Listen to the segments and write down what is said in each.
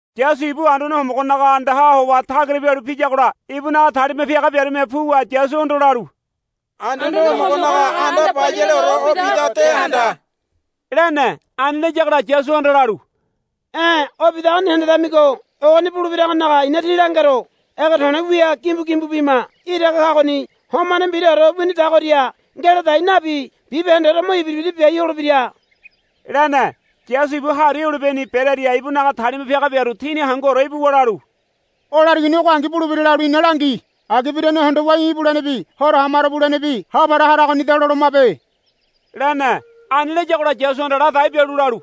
Yasu ibu Anduane Homogonaga andaha howa tagira pialu piyagola ibunaga talima piaga biarume puwa Yasuhondo lalu, Anduane Homogonaga anda bayaleore o bidago de handa, lene. Ani layagola Yasuhanda lalu, E̱ o bidagoni hendedamigo ogoni bulebiragonaga i̱na tí langero. Ege to̱le̱ wia gimbu gimbu bima iraga kagoni homane mbiraore winidagoria ngeladai nabi bibahendeore mo ibira ibira biai holebira, lene. Yasu ibu Hari Olibeni berearia ibunaga talima piaga biaru tini hanguore ibuwa lalu, O larigoni ogongi bulebira lalu ina langi. Agi birane hondowa í̠ ibulenebi horo hamaro bulenebi ha para haragonida lolomabe, lene. Ani layagola Yasuhanda ladai bialu lalu,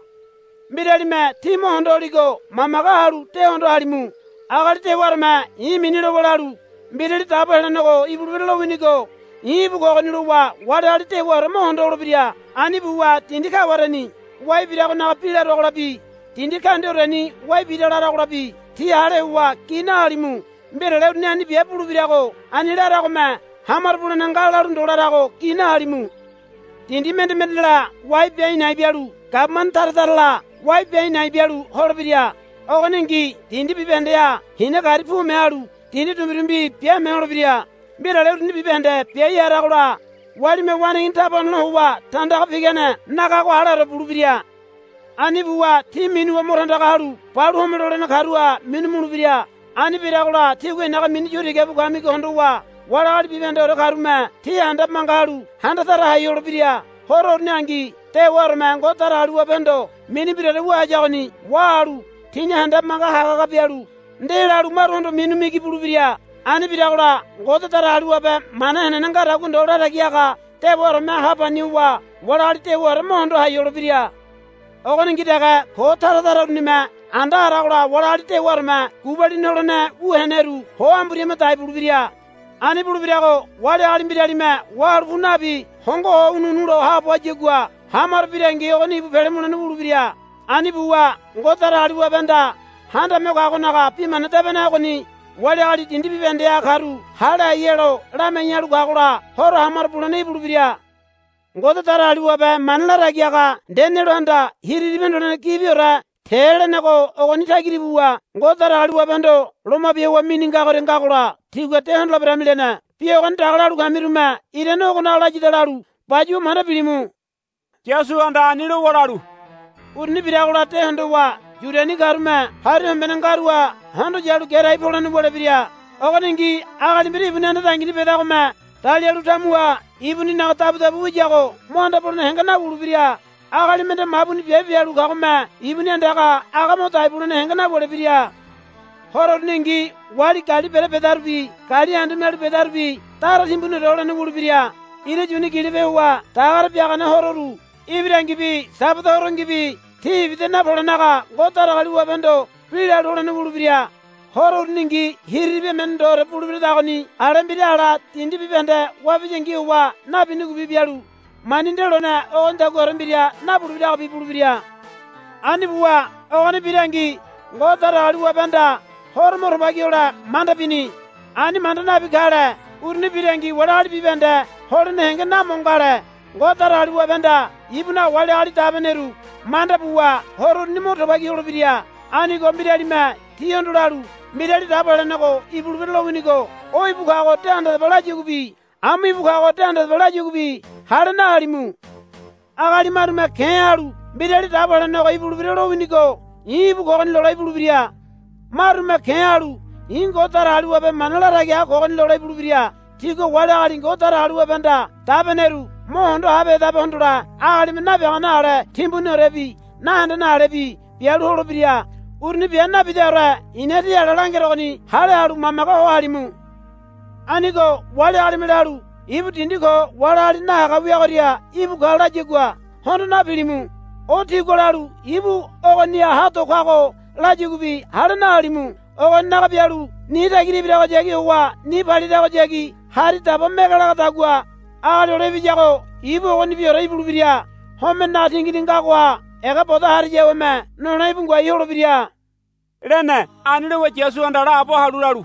Mbiralime tí mo hondo holigo mamage halu de hondo halimu. Agali dewaoreme i̱ mini lowa lalu, Mbirali Dabo Helenego ibulebira lowinigo i̱ íbu kogoni, lowa wali agali dewaore mo hondo holebira. Ani buwa dindi kawareni wai biragonaga bi laruagolabi dindi kaundiaoreni wai bira laragolabi tí hale howa gi nahalimu. Mbirale uruni ani bia bulebirago ani laragome ha maro bulene nga lalu ndo larago gi nahalimu. Dindi mende mendela wai bia a̱i̱ na̱i̱ bialu gabumane tara tarala wai bia a̱i̱ na̱i̱ bialu holebira. Ogoningi dindi bibahendeha hina gari pume halu dindi dumbirumbi biame holebira. Mbirale uruni bibahende biai haragola walime waneigini taba honole howa tandaga pigane nagago aleore bulebira. Ani buwa tí minuwa mo tandaga halu balu home lolene karuha minu mulebira. Ani biragola tígua i̱naga mini yu tiga bu kamigo hondowa wali agali bibahendeore karume tí handabe manga halu handa tara hai holebira. Horo uruningi dewaoreme Ngode Datagaliwabehondo mini mbiraore wu hayagoni wahalu tini handabe manga haga haga bialu ndelalu maruhondo minu migi bulebira. Ani biragola Ngode Datagaliwabe mana henene ngadagua ndo latagi haga dewaoreme ha pani howa wali agali dewaore mo hondo hai holebira. Ogoningi dege ko tara tara urunime anda haragola wali agali dewaoreme gubalini holene wu heneru ho amburi hama dai bulebira. Ani bulebirago wali agali mbiralime wahalu pu nabi hongo howa ho ununu lo haabo hayagua hamaro birangi ogoni ibu pele mulene wulebira. Ani buwa Ngode Datagaliwabehanda Handame Ho Kagonaga Bi Mana Debene ogoni wali agali dindi bibahendeha karu hale hai helo lamiai halu kagola horo hamaro bulene ibulebira. Ngode Datagaliwabe mana latagi haga Danielehanda Hiriribi Hondolene Gibiore te lenego ogoni tagira ibuwa Ngode Datagaliwabehondo loma bia howa mini ngagoria ngagola tígua de hondoleberami lene. Bi ogoni daga lalu kamirume irane ogonaga layada lalu bayuwa manda bilimu. Yasuhanda ani lowa lalu, Uruni biragola de hondowa Yudiani karume hari hombene ngaruha hondo yalu gerai polene wulebira. Ogoningi agali mbira ibuni anda dangini bedagome dalialu tamuha ibuninaga dabudabu wiyago mo anda polene henge nawulebira. Agali mende mabuni biabe bialu kagome ibuni andaga aga mo dai bulene henge nawulebira. Horo uruningi wali gali bere bedarubi gali andu mialu bedarubi dara timbuniore holene wulebira. Ira yuni gilope howa dagare biagane hororu ibirangibi Sabada Horongibi tí ibida napolenaga Ngode Datagaliwabehondo bi lalu holene wulebira. Horo uruningi hiriribi emene ndoore bulebiradagoni ale mbira ala dindi bibahende wabiyangi howa nabinigobi bialu mani nde lone ogonidaguaore mbira nabulebiragobi bulebira. Ani buwa ogoni birangi Ngode Datagaliwabehanda horo mo tubagi hole manda bini. Ani manda nabi kale uruni birangi wali agali bibahende holene henge na mo ngale. Ngode Datagaliwabehanda ibunaga wali agali dabeneru manda buwa horo uruni mo tubagi holebira. Anigo mbiralime tíhondo lalu, Mbirali Dabo Helenego ibulebira lowinigo o íbu kago de handadaba, layaguabi, Amu íbu kago de handadaba, layaguabi hale nahalimu. Agali marume ke̱ halu, Mbirali Dabo Helenego ibulebira lowinigo i̱ íbu kogoni, lole ibulebira. Marume ke̱ halu, I̱ Ngode Datagaliwabe mana latagi haga kogoni, lole ibulebira. Tigua wali agali Ngode Datagaliwabehanda dabeneru mo hondo habehedabe hondole agalime nabiagane ale timbuniorebi nahendene alebi bialu holebira. Uruni bia nabidaore i̱na tí ala langerogoni hale halu mamage ho halimu. Anigo wali agalime lalu, Ibu dindi ko wali agali nahaga wiagoria íbu ka, layagua hondo napilimu. O tigua lalu, Ibu ogoni ha do kago, layaguabi hale nahalimu. Ogoninaga bialu ni tagira ibiragohayagi howa ni paliragohayagi hari daba mege lagadagua Agali Hole Ibiyago ibu ogonibiore ibulebira. Homenenaga tingini ngagoha ega bodo hariaweme nole íbu ngoai holebira, lene. Ani lowa Yasuhanda laabo halu lalu,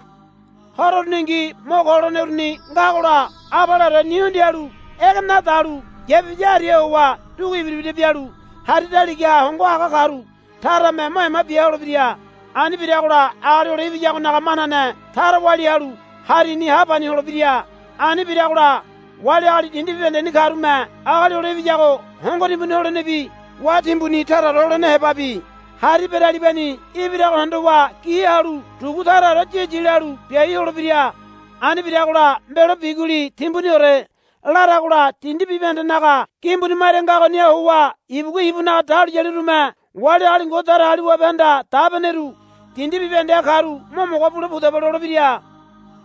Horo uruningi mo ko holene uruni ngagola abaleore ni hundialu ege nadalu yapibiya hariha howa dugu ibira ibira bialu hari daligaha hongo haga karu tarame mo ema bia holebira. Ani biragola Agali Hole Ibiyagonaga manane tara walia halu harini ha pani holebira. Ani biragola wali agali dindi bibahendeni karume Agali Hole Ibiyago hongo timbuni holenebi wá timbuni taraore holene hebabi hari beralibani ibirago hondowa gi halu dugu taraore yi yi lalu biai holebira. Ani biragola mbelo biguli timbuniore laragola dindi bibahendenaga gimbuni maria ngagoniha howa ibugua ibunaga dahuliyalirume wali agali Ngode Datagaliwabehanda dabeneru dindi bibahendeha karu, Mo mogo bule pudaba, lolebira.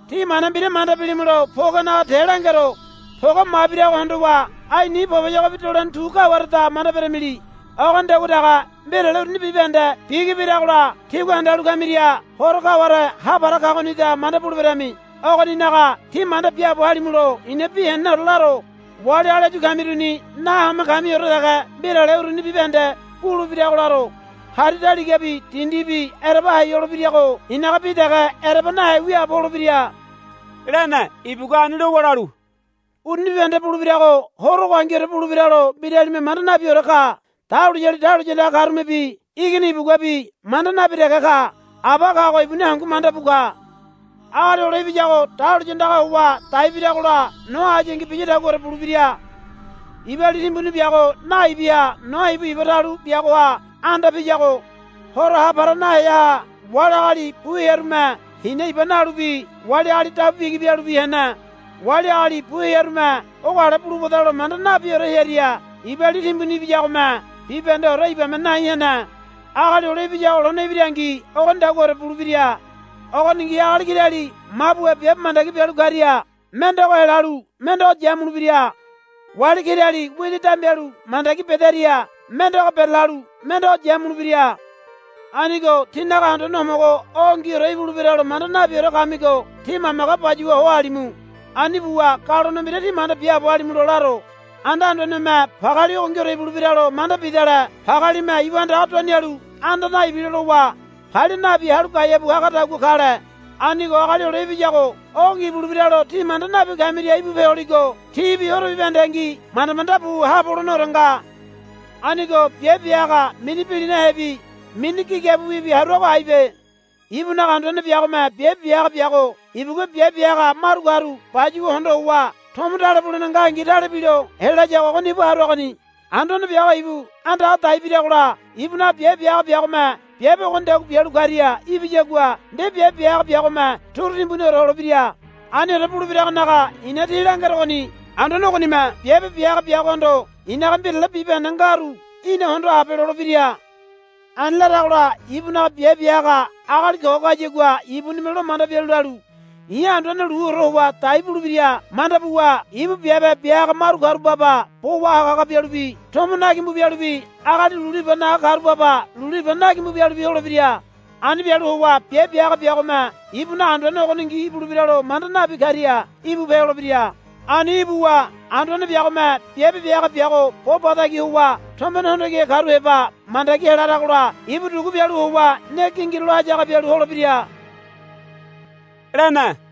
Tí mana mbira manda bilimulo pogenaga te langero. Poge mabirago hondowa ai ni poboyogobi dolene tu kawareda manda beramili. Ogonidagua dege mbirale uruni bibahende bigi biragola tígua handalu kamiria horo kaware ha para kagonida manda buleberami. Ogoninaga tí manda biaabo halimulo i̱na bi heneneore laro. Wali agali áyu kamiruni nahome kamiore dege mbirale uruni bibahende bulebirago laro. Hari daligabi dindibi ereba hai holebirago i̱naga bi dege ereba nahe wiaabo holebira, lene. Ibugua ani lowa lalu, Uruni bibahende bulebirago horo ogo angiore bulebiralo mbiralime manda nabiore ka. Dahuliyali dahuliya andaga karumebi Igini ibuguabi manda nabi dege ka. Aba kago ibuni hangu manda bu ka. Agali Hole Ibiyago dahuliya andaga howa daibiragola Noa hayangi biyadaguaore bulebira. Iba li timbuni biago naibiaha Noa ibu iba talu biagoha anda piyago horo ha para naheaha wali agali bu hearume hina iba nalubi wali agali dabu bigi bialubi hene. Wali agali bu hearume ogo ale bulubadalo manda nabiore hearia iba li timbuni ibiyagome bibahendeore ibame nai hene. Agali Hole Ibiyago lone ibirangi ogonidaguaore bulebira. Ogoningi agali kirali mabuha biabe mandagi bialu karia mendego helalu mendego yamulebira. Wali kirali widi dambialu mandagi bedaria mendego berelalu mendego yamulebira. Anigo tínaga Anduane Homogo ogongiore ibulebiralo manda nabiore kamigo tí mamage bayuwa ho halimu. Ani buwa galone mbira tí manda biaabo halimulo laro. Anda anduaneme pageali ogongiore ibulebiralo manda bidale pagealime ibu andaga duanialu anda naibilo lowa palia nabi halu gaeabu hagadagua kale. Anigo Agali Hole Ibiyago ogongi ibulebiralo tí manda nabi kamiria íbupe holigo tíbi horo bibahendengi manda manda bu haabo holeneore nga. Anigo biabe bia haga mini bilinahebi mini gigabiwibi haruago aibe. Ibunaga anduane biagome biabe bia haga biago ibugua biabe bia haga maru karu bayuwa hondo howa tomo tale bulene ngangi tale bilo helayago ogoni ibu haruagoni. Anduane biago ibu andaga dai biragola ibunaga biabe bia haga biagome biabe ogonidagua bialu karia ibiyagua nde biabe bia haga biagome turu timbuniore holebira. Aniore bulebiragonaga i̱na tí langerogoni. Anduane ogonime biabe bia haga biagohondo, I̱naga mbirale bibahende ngaru í̠na hondo habe, lolebira. Ani laragola ibunaga biabe bia haga agali ko kayagua ibunime lo manda bialu lalu, I̱ anduane luore howa dai bulebira, manda buwa ibu biabe bia haga maru karu baba bo wahaga haga bialubi tomo na gimbu bialubi agali lulu iba naga karu baba lulu iba na gimbu bialubi holebira. Ani bialu howa biabe bia haga biagome ibunaga anduane ogongi ibulebiralo manda nabi karia íbupe holebira. Ani ibuwa anduane biagome biabe bia haga biago bo ba tagi howa tombene hondo kihe karu heba mandagi helaragola ibu dugu bialu howa ne gingirulo hayaga bialu holebira, lene.